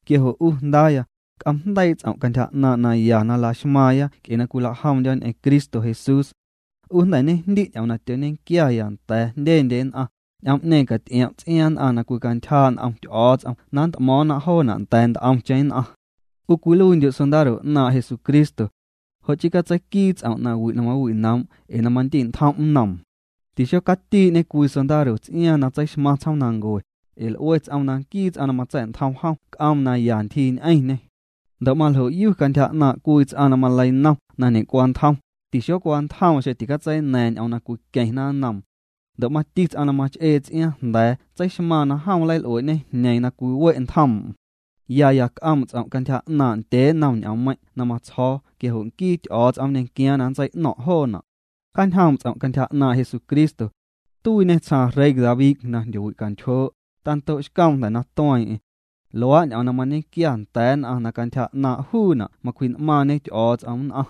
Quia jo' 'u jndaaya, c'oom'jndeii' ts'om' cantyja 'naaⁿ' naya na laxmaaⁿya nc'e na cwilajomndyo̱ ñ'eⁿ Cristo Jesús. 'U jnda̱ ñejndi' ñ'oom na tyoñequiaya nda̱a̱ jndyendye nn'aⁿ, ñ'oom'ñeeⁿ caty'iom' ts'iaaⁿ nn'aⁿ na cwicantyjaa' n'om Ty'o̱o̱ts'om na nnt'mo̱o̱ⁿna joona' nda̱a̱ nt'omcheⁿ nn'aⁿ. 'U cwiluiindyu' sondaro 'naaⁿ' Jesucristo. Jo' chii catseiquii ts'om' nawi' na mawi'noom' ee na mandi'ntjom nnoom. Tixocatii'ñe cwii sondaro ts'iaaⁿ na tseixmaⁿ tsjoomnancue, ee l'ue ts'oom na nquii ts'aⁿ na matsa̱'ntjom jom c'oom na ya ntyjii ñ'eñê. Ndo' maljoyu cantyja 'naaⁿ' cwii ts'aⁿ na maleinom na ñecwantjom, tixocwantjoom xeⁿ ticatseicaña̱a̱ⁿ ñ'oom na cwiqueⁿna nnoom. Ndo' mati ts'aⁿ na mach'ee ts'iaaⁿ jnda̱a̱ tseixmaaⁿ na jom nleil'uee'ñe jñeeⁿ na cwiwe' ntjoom'm. Yaya c'oom' ts'om' cantyja 'naaⁿ' ndyee nnom ñ'oommeiⁿ' na matsjo̱o̱ quia jo' nquii Ty'o̱o̱ts'om nñequiaaⁿ na nntsei'no̱ⁿ' joona'. Cjaañjoom' ts'om' cantyja 'naaⁿ' Jesucristo. Tuiiñê tsjaaⁿ rey David na jndyowicantyjoo', tando'xcoom jnda̱ na tueeⁿ'eⁿ. Luaa' ñ'oom na mañequia nda̱a̱ nn'aⁿ na cantyja 'naaⁿ' juuna' macwji'n'maaⁿñe Ty'o̱o̱ts'om nn'aⁿ.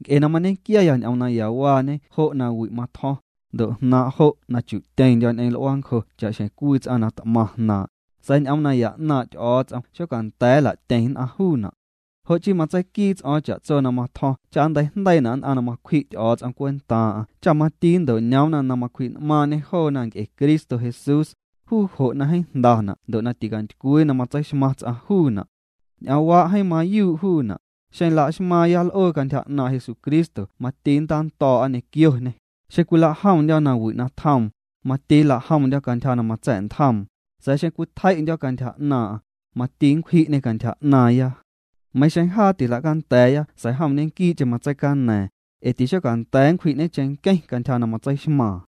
Nc'e na mañequiaya ñ'oom nayawaañe jo' na wi' matjo̱ⁿ, ndo' jnaaⁿ' jo' na chu'tyeⁿndyo̱ ñ'eⁿ l'uaancjo cha'xjeⁿ cwii ts'aⁿ na t'maⁿ jnaaⁿ', sa̱a̱ ñ'oom naya 'naaⁿ' Ty'o̱o̱ts'om xocanda̱a̱ nla'tyeⁿ nn'aⁿ juuna'. Jo' chii matseiquii ts'o̱o̱ⁿ cha'tso na matjo̱ⁿ cha nnteijndeiina' nn'aⁿ na macwji' Ty'o̱o̱ts'om cwentaaⁿ'aⁿ cha mati nnto'ñoomna na macwji'n'maaⁿñê joona nc'e Cristo Jesús, juu jo' na jeeⁿ jndana' ndo' na ticantycwii na matseixmaⁿ ts'aⁿ juuna'. Ñ'oomwaa jeeⁿ mayuu' juuna': Xeⁿ la'xmaaⁿya l'oo cantyja 'naaⁿ' Jesucristo mati nntando̱o̱'a ñequioñê, xeⁿ cwila'jomndyo̱ nawi' na tjoom, mati nla'jomndyo̱ cantyja na matsa̱'ntjoom, sa̱a̱ xeⁿ cwitjei'ndyo̱ cantyja 'naaⁿ'aⁿ, mati nncwji'ñê cantyja 'naaⁿya. meiⁿ xeⁿ jaa tila'canda̱a̱ya sa̱a̱ jom ñequii'cheⁿ na matseicaña̱a̱ⁿ, ee tixocanda̱a̱ nncwji'ñe cheⁿnqueⁿ cantyja na matseixmaaⁿ.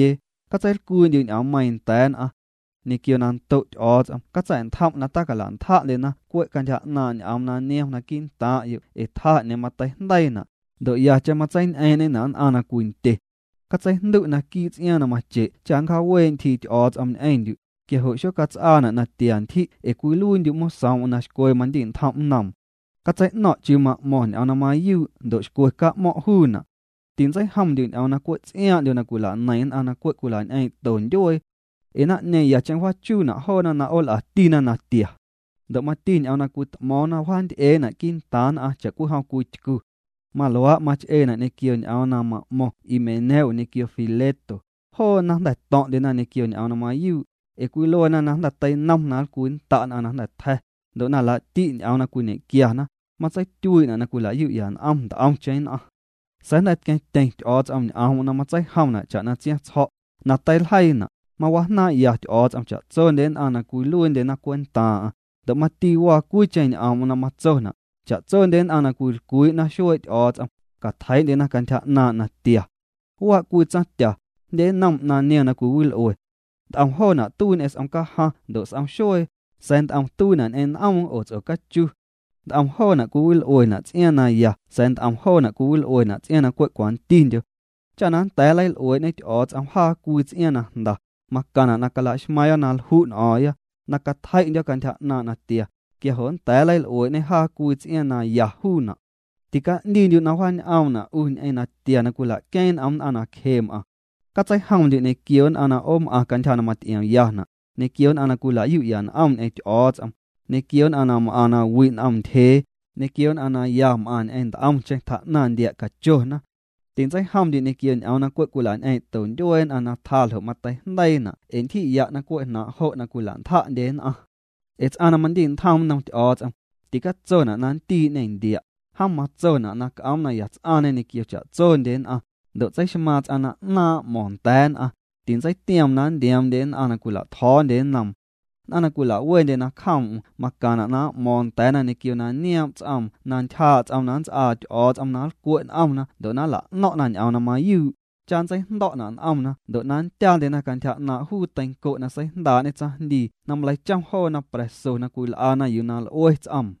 Catseilcwii'ndyu' ñ'oommeiiⁿ nda̱a̱ nn'aⁿ. Ñequio na ndo' Ty'o̱o̱ts'om catsa̱'ntjom' na tacala'ntja'ndyena na cwe' cantyja 'naaⁿ ñ'oom na niom naquii' ntaaⁿ'yo' ee tjaa 'ñeeⁿ mateijndeiina', ndo' yacheⁿ matseiñ'eeⁿ'ñena' nn'aⁿ na cwindye. Catseijndu' naquii' ts'iaaⁿ na mache' cha nncjaawee' ntyjii Ty'o̱o̱ts'om ñ'eⁿndyu', quia jo' xocats'aana' na tia ntyji' ee cwiluiindyu' mosoom'm na xcwe mandi'ntjom nnoom. Catsei'no̱ⁿ' chiuu ma'mo̱ⁿ ñ'oom na mayuu' ndo' xcwe ca'mo̱ⁿ' juuna'. Tintseijomndyu' ñ'oom na cwe' ts'iaaⁿ'ndyo na cwila'neiⁿ nn'aⁿ na cwe' cwila'ñ'eeⁿ'to ndyuee. Ee naⁿ'ñeeⁿ yacheⁿ wjaachuuna' joona na 'ool'atina natia. Ndo' mati ñ'oom na cwit'mo̱o̱ⁿna wjaanty'eena' quii'ntaaⁿ nn'aⁿ cha'cwijom cwii tycu. Maluaa' mach'eena' ñequio ñ'oom na ma'mo̱ⁿ Himeneo ñequio Fileto, joona jnda̱ to̱ⁿ'ndyena ñequio ñ'oom na mayuu', ee cwiluena na jnda̱ teinom na nlcwinnda' nn'aⁿ na jnda̱ tja̱, ndo' na laa'ti' ñ'oom na cwiñequiana, matseityuii'na' na cwila'yu'ya n'om nt'omcheⁿ nn'aⁿ. Sa̱a̱ jnda̱ tqueⁿtyeⁿ Ty'o̱o̱ts'om ñ'oom na matseijomna' cha'na tsiaⁿtsjo̱', na teiljeiina': “Mawajnaaⁿ'ya Ty'o̱o̱ts'om cha'tsondye nn'aⁿ na cwiluiindye cwentaaⁿ'aⁿ”, ndo' mati waa cwiicheⁿ ñ'oom'm na matsona': “Cha'tsondye nn'aⁿ na cwilcwii'na xuee' Ty'o̱o̱ts'om, catjeii'ndyena cantyja 'naaⁿ' natia.” Waa' cwii tsaⁿtya, jndye nnom 'naⁿ niom na cwiwil'ue. Nt'om joona' tuii ñequio s'om cajaⁿ ndo' s'om xuee, sa̱a̱ nt'om tuiina' ñ'eⁿ n'oom oo ts'ocachu. Nt'om joona' cwiwil'uena' ts'iaaⁿ na ya sa̱a̱ nt'om joona' cwiwil'uena' ts'iaaⁿ na cwe' cwantindyo. Cha na nnda̱a̱ nleil'uee'ñe Ty'o̱o̱ts'om jaa cwii ts'iaaⁿ na jnda, macaⁿna' na cala'xmaaⁿya na lju' n'o̱o̱ⁿya, na cwitjei'ndyo̱ cantyja 'naaⁿ' natia, quia jo' nnda̱a̱ nleil'uee'ñê jaa cwii ts'iaaⁿ na ya juuna'. Tica'ndiindyu' na wjaañ'oomna' 'u ñ'eⁿ natia na cwila'queeⁿ n'om nn'aⁿ na cje m'aⁿ. Catseijomndyu' ñequio nn'aⁿ na 'oom'aⁿ cantyja na maty'iomyana', ñequio nn'aⁿ na cwila'yu'ya n'om ñ'eⁿ Ty'o̱o̱ts'om, ñequio nn'aⁿ na m'aⁿ na wi' n'om ntyjee, ñequio nn'aⁿ na ya m'aⁿ ñ'eⁿ nt'omcheⁿ tjaa'naⁿ ndia' cachona. Tintseijomndyu' ñequio ñ'oom na cwe' cwila'ñ'eeⁿ'to ndyuee nn'aⁿ na tjaa ljo' mateijndeiina' ee ntyji'ya' na cwe' jnaaⁿ' jo' na cwila'ntja'ndye nn'aⁿ. Ee ts'aⁿ na mandi'ntjom nnom Ty'o̱o̱ts'om, ticatsona' na nntii'ñe ndia'. Jom matsona' na c'oom na ya ts'aⁿñe ñequio cha'tsondye nn'aⁿ, ndo' tseixmaaⁿ ts'aⁿ na 'naaⁿ' m'mo̱ⁿ nda̱a̱ nn'aⁿ, tintseitioom na ndioomndye nn'aⁿ na cwila'tjo̱o̱ndye nnoom. Nn'aⁿ na cwila'wendye nacjoom'm macaⁿna' na m'mo̱o̱ⁿ nda̱a̱na ñequio na nioom' ts'oom na ntyjaa' ts'oom na nnts'aa Ty'o̱o̱ts'om na nlcwe' n'omna ndo' na nla'no̱ⁿ'na ñ'oom na mayuu', cha nntseijndo̱'na' n'omna ndo' na nndyaandyena cantyja 'naaⁿ' juu teinco' na seijndaa'ñe tsaⁿjndii na maleichom joona pra̱so na cwil'ana yuu na l'ue ts'oom.